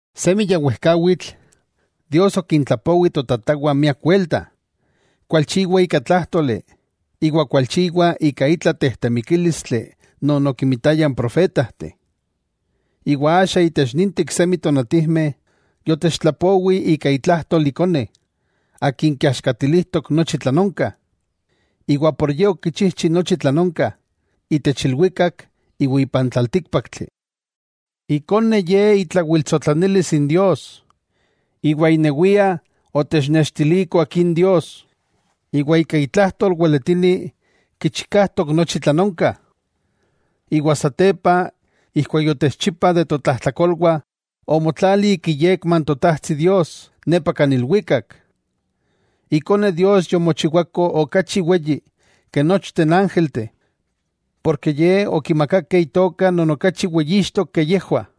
Semi ya wejkawitl Dios okintlapowi totatawah miak welta, kualchiwa ika tlájtoli iwa kualchiwa ika itla tejtemikílistli non okinmitaya n profetajteh. Iwa axa itech ninteh iksemi tonatijmeh yotechtlapowi ika itlajtol Ikone. Akin kiaxkatilijtok nochi tlan onka, iwa por Ye okichijchi nochi tlan onka itech ilwikak iwa ipan tlaltíkpaktli. Ikone Ye itlawiltsotlanilis n Dios, iwa inewia otechnextiliko Akin Dios, iwa ika itlajtol weletini kichikajtok nochi tlan onka. Iwa satepa ijkuak yotechchipa de totlajtlakolwah, omotlali ik iyekma n Totajtsi Dios nepa kan ilwikak. Ikone Dios yomochiwako okachi weyi ke nochteh n ángelteh, porke Ye okimakakeh Itoka non okachi weyixtok ke yejwah.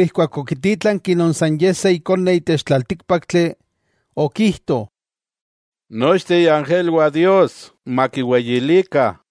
Keman okitítlanki non san Ye se Ikone itech tlaltíkpaktli, okijto: Nochteh iangelwah Dios makiweyilikah.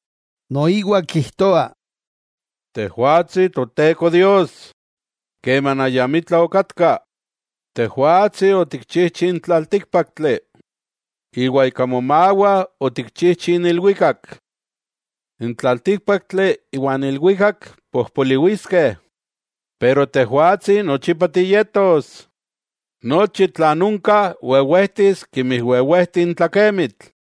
Noiwa kijtoa: Tejwatsi Toteko Dios keman ayamitla okatka, Tejwatsi otikchijchi n tlaltíkpaktli, iwa ika momawah otikchijchi n ilwikak. N tlaltíkpaktli iwa ilwikak pojpoliwiskeh, pero Tejwatsi nochipa tiyetos. Nochi tlan onka wewejtis kemi wewejti n tlakemitl.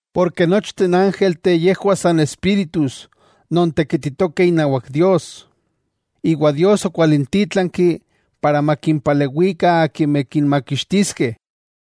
Porke nochteh n ángelteh yejwah san espíritus non tekititokeh inawak Dios, iwa Dios okwalintítlanki para makimpalewikah akimeh kinmakixtiskeh.